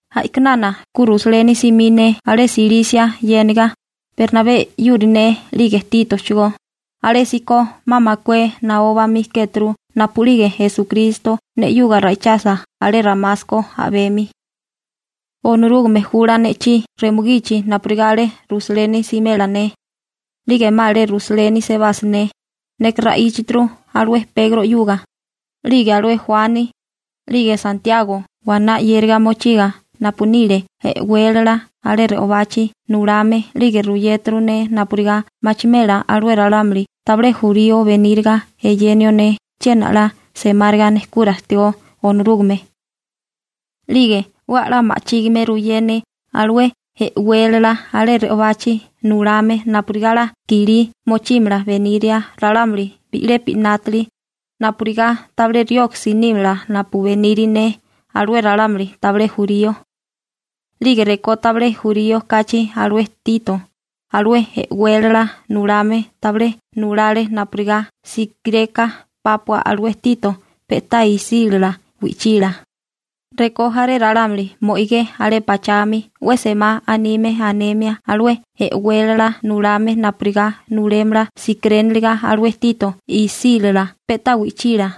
A'kinana ku Rusaleni simí ne alé Silisia yéniga, Bernabé 'yuri ne 'lige Títochigó, alésíko 'ma makué naó bamí kéturu napu'lige Esukristo ne 'yuga ra'ichasa alé Ramasko a'bemi. Onorúgame jula ne'chí remugichi napurigá alé Rusaleni simela ne. 'Lige 'ma alé Rusaleni sebasa ne, neka ra'íchaturu alué Pegro 'yuga, 'lige alué Juani, 'lige Santiago waná 'yériga mochiga napu nile e'wélala alé re'obachi nulame 'lige ruyéturu ne napurigá machimela alué ralámuli tabilé jurío beníriga eyenio ne chiena 'la semáriga nejkura ajtigó Onorúgame. 'Lige 'we 'la ma'chígime ruyé ne alué e'wélala alé re'obachi nulame napurigá 'la kilí mochímala beníria ralámuli bi'lepi 'nátili, napurigá tabilé rioksi nímala napu beniri ne alué ralámuli tabilé jurío. 'Lige rekó tabilé jurío kachi alué Tito, alué e'wélala nulame tabilé nulale napurigá sikireka pápua alué Tito pe'tá isílala wi'chila, rekó jaré ralámuli mo'igé alé pachami 'we semá anime anemia alué e'wélala nulame napurigá nulémala sikiréniliga alué Tito isílala pe'tá wi'chila.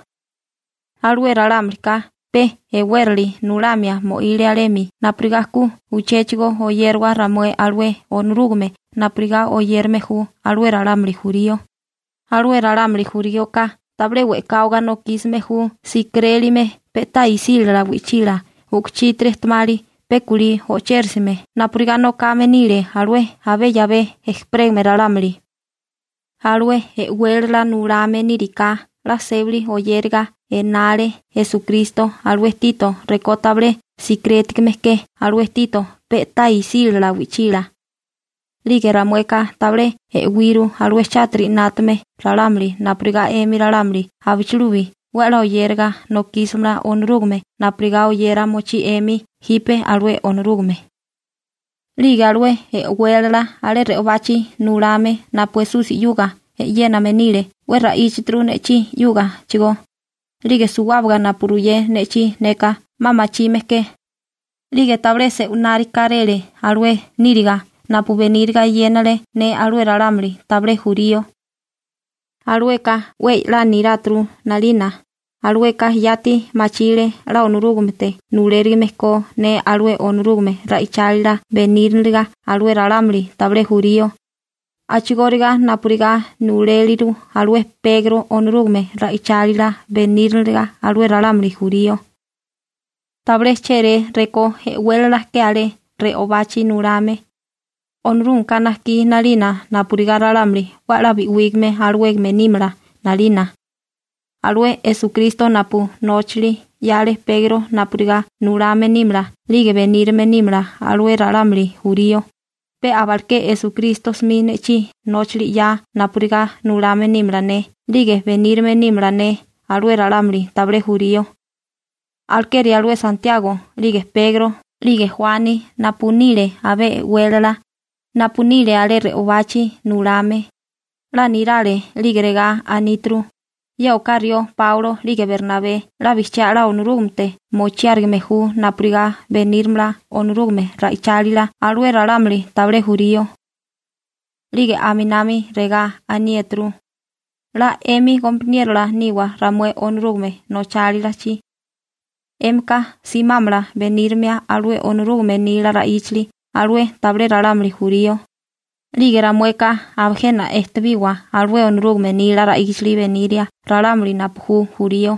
Alué ralámulika pe e'wérali nulamia mo'ile alemi napurigá ku uchéchigo oyérawa ramué alué Onorúgame napurigá oyérame ju alué ralámuli jurío, alué ralámuli juríoka tabilé we'káwaga nokísime ju sikirélime pe'tá isílala wi'chila u'kuchítiri ejtemali pe kulí o'chérisime napurigá nokame nile alué abé 'yabé ejperégame ralámuli. Alué e'wélala nulame níriká 'la sébali oyériga enale Esukristo alué Tito rekó tabilé sikirétigame ke alué Tito pe'tá isílala wi'chila. 'Lige ramueka tabilé e'wiru alué chátiri 'nátame ralámuli napurigá 'emi ralámuli abichilubi 'we a'lá oyéraga nokísimala Onorúgame napurigá oyera mochí 'emi jipe alué Onorúgame. 'Lige alué e'wélala alé re'obachi nulame napu Esusi 'yuga e'yéname nile 'we ra'íchaturu ne'chí 'yúgachigó, 'lige suwábaga napu ruyé ne'chí neka 'ma machime ke. 'Lige tabilé se'winárikáréle alué níriga napu beníriga eyénale ne alué ralámuli tabilé jurío. Alueka 'we 'la niráturu 'nalina, alueka yati machile 'la Onorúgamete nulérigime ko ne alué Onorúgame ra'ichálila beníriniliga alué ralámuli tabilé jurío, a'chigóriga napurigá nuléliru alué Pegro Onorúgame ra'ichálila beníriniliga alué ralámuli jurío. Tabilé chéré rekó e'wélala ke alé re'obachi nulame, Onorúgameka najkí 'nalina napurigá ralámuli 'we 'la bi'wígame alawégame nímala 'nalina. Alué Esukristo napu nóchali 'yale Pegro napurigá nulame nímala 'lige benírame nímala alué ralámuli jurío, pe abaleké Esukristo 'smi ne'chí nóchali 'ya napurigá nulame nímala ne 'lige benírame nímala ne alué ralámuli tabilé jurío. Alekeri alué Santiago 'lige Pegro (Sepasi) 'lige Juani napu nile abé e'wélala, napu nile alé re'obachi nulame, 'la nirale 'lige regá aníturu: «Ye oká rió Páulo 'lige Bernabé 'la bijchiá 'la Onorúgamete mochiárigime ju napurigá benírimala Onorúgame ra'ichálila alué ralámuli tabilé jurío.» 'Lige aminami regá aniéturu: «'La 'emi gompaniérola niwa ramué Onorúgame nochálilachi. 'Émika simámala benírimia alué Onorúgame nila ra'íchali alué tabilé ralámuli jurío, 'lige ramueka aba jena ejtebiwa alué Onorúgame nila ra'íchali beniria ralámuli napu ju jurío.»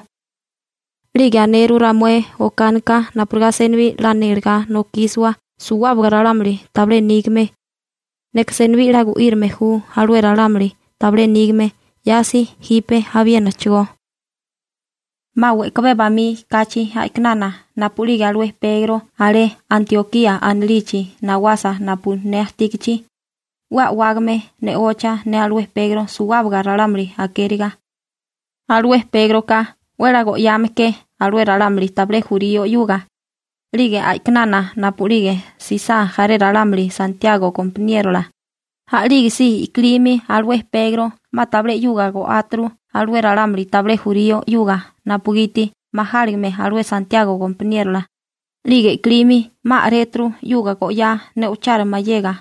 'Lige aneru ramué okánika napurigá senibí 'la nélegá nokísiwa suwábaga ralámuli tabilé nígame. Neka senibí 'la gu'írame ju alué ralámuli tabilé nígame, 'yasi jipe abiénachigó. 'Ma we'kabé bamí kachi a'kinana napu'lige alué Pegro alé Antiokía anilichi nawasa napu ne ajtígichi, 'we a'wágame ne'ocha ne alué Pegro suwábaga ralámuli akériga. Alué Pégroka 'we 'la go'yame ke alué ralámuli tabilé jurío 'yuga, 'lige a'kinana napu'lige jsisá jaré ralámuli Santiago gompaniérola, a'lígesí i'kilimi alué Pegro 'ma tabilé 'yuga go'áturu alué ralámuli tabilé jurío 'yuga napugiti majáligime alué Santiago gompaniérola, 'lige i'kilimi 'ma a'réturu 'yuga go'yá ne'ochara mayega.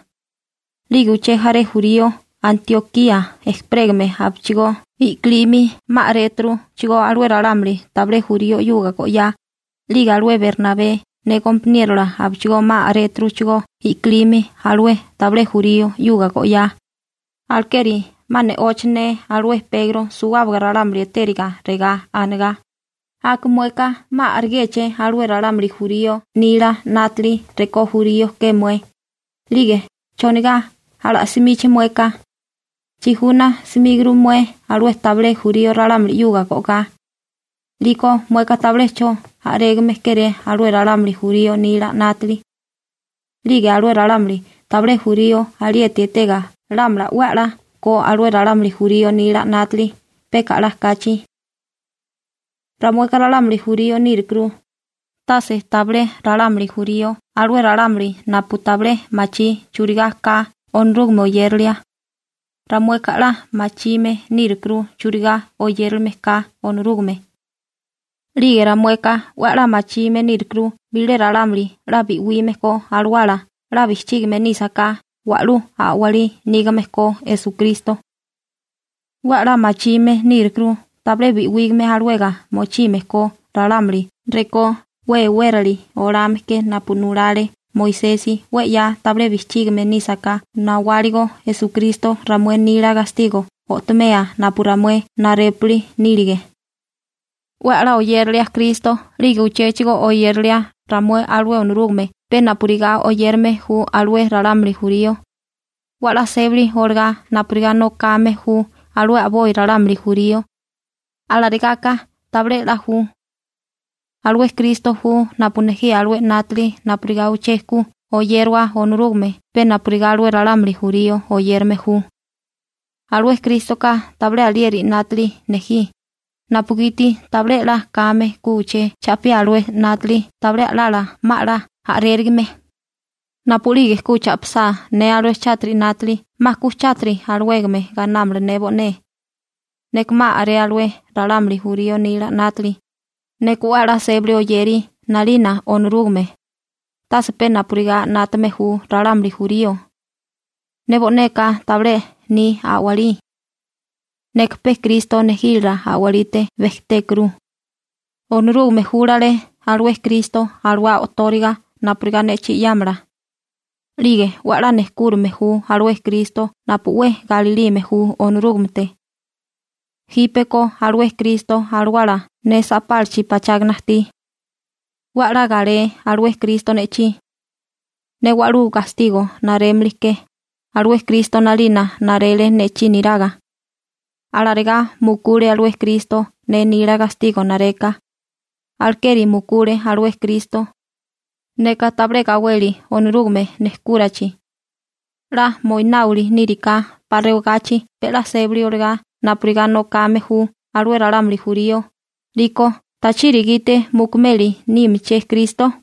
'Lige uché jaré jurío Antiokía ejperégame abichigó i'kilimi 'ma a'réturuchigó alué ralámuli tabilé jurío 'yuga go'yá. 'Lige alué Bernabé ne gompaniérola abichigó 'ma a'réturuchigó i'kilimi alué tabilé jurío 'yuga go'yá. Alekeri 'ma ne'ocha ne alué Pegro suwábaga ralámuli etériga regá anegá: «Aka mueka 'ma a'regéché alué ralámuli jurío nila 'nátili rekó jurío ke mué, 'lige ¿chonigá ala'simíché mueka? Chijuna 'smíguru mué alué tabilé jurío ralámuli 'yuga go'gá. 'Liko mueka tabilé 'cho a'régame kéré alué ralámuli jurío nila 'nátili. 'Lige alué ralámuli tabilé jurío alieti etega lámala 'we 'la ko alué ralámuli jurío nila 'nátili peka 'la kachi.» Ramueka ralámuli jurío nírukuru, tase tabilé ralámuli jurío alué ralámuli napu tabilé machí churigá ka Onorúgame oyéralia. Ramueka 'la machime nírukuru churigá oyérilime ka Onorúgame. 'Lige ramueka 'we 'la machime nírukuru bilé ralámuli 'la bi'wime ko alawala 'la bijchígame nísaká wa'lú a'walí nígame ko Esukristo. 'We 'la machime nírukuru tabilé bi'wígame alawega mochime ko ralámuli rekó 'we e'wérali olame ke napu nulale Moisesi 'we 'ya tabilé bijchígame nísaká nawáligo Esukristo ramué nila gastigo o'tomea napu ramué narépuli nílige. 'We 'la oyérilia Kristo 'lige uchéchigo oyérilia ramué alué Onorúgame pe napurigá oyérame ju alué ralámuli jurío, 'we 'la sébali olagá napurigá nokame ju alué a'boi ralámuli jurío, alarigá ka tabilé 'la ju. ¿Alué Kristo ju napu nejí alué 'nátili napurigá uché ku oyérawa Onorúgame pe napurigá alué ralámuli jurío oyérame ju? Alué Krístoka tabilé alieri 'nátili nejí, napugiti tabilé 'la kame ku uché cha'piá alué 'nátili tabilé a'lala 'ma 'la a'rérigame. Napu'lige ku cha'pisá ne alué chátiri 'nátili 'ma ku chátiri alawégame gainámala ne bo'né. Neka 'ma a'ré alué ralámuli jurío nila 'nátili, neka 'we 'la sébali oyeri 'nalina Onorúgame, tase pe napurigá 'nátame ju ralámuli jurío. Ne bo'neka tabilé ni a'walí. Neka pe Kristo nejílala a'walite bejtékuru. Onorúgame júlale alué Kristo alawá o'tóriga napurigá ne'chí 'yámala. 'Lige 'we 'la nejkúrame ju alué Kristo napu 'we galilime ju Onorúgamete. Jípeko alué Kristo Alawala ne sa'pálachi pachágana ajtí. 'We 'la galé alué Kristo ne'chí. Ne wa'lú gastigo narémili ke, alué Kristo 'nalina narele ne'chí niraga. Alarigá mukule alué Kristo ne nila gastigo nareka. Alekeri mukule alué Kristo. Neka tabilé gaweli Onorúgame nejkúrachi. 'La moináwili níriká 'pa rewagachi pe 'la sébali olagá napurigá nokame ju alué ralámuli jurío, 'liko ¿tachiri gite mukumeli nímiché Kristo?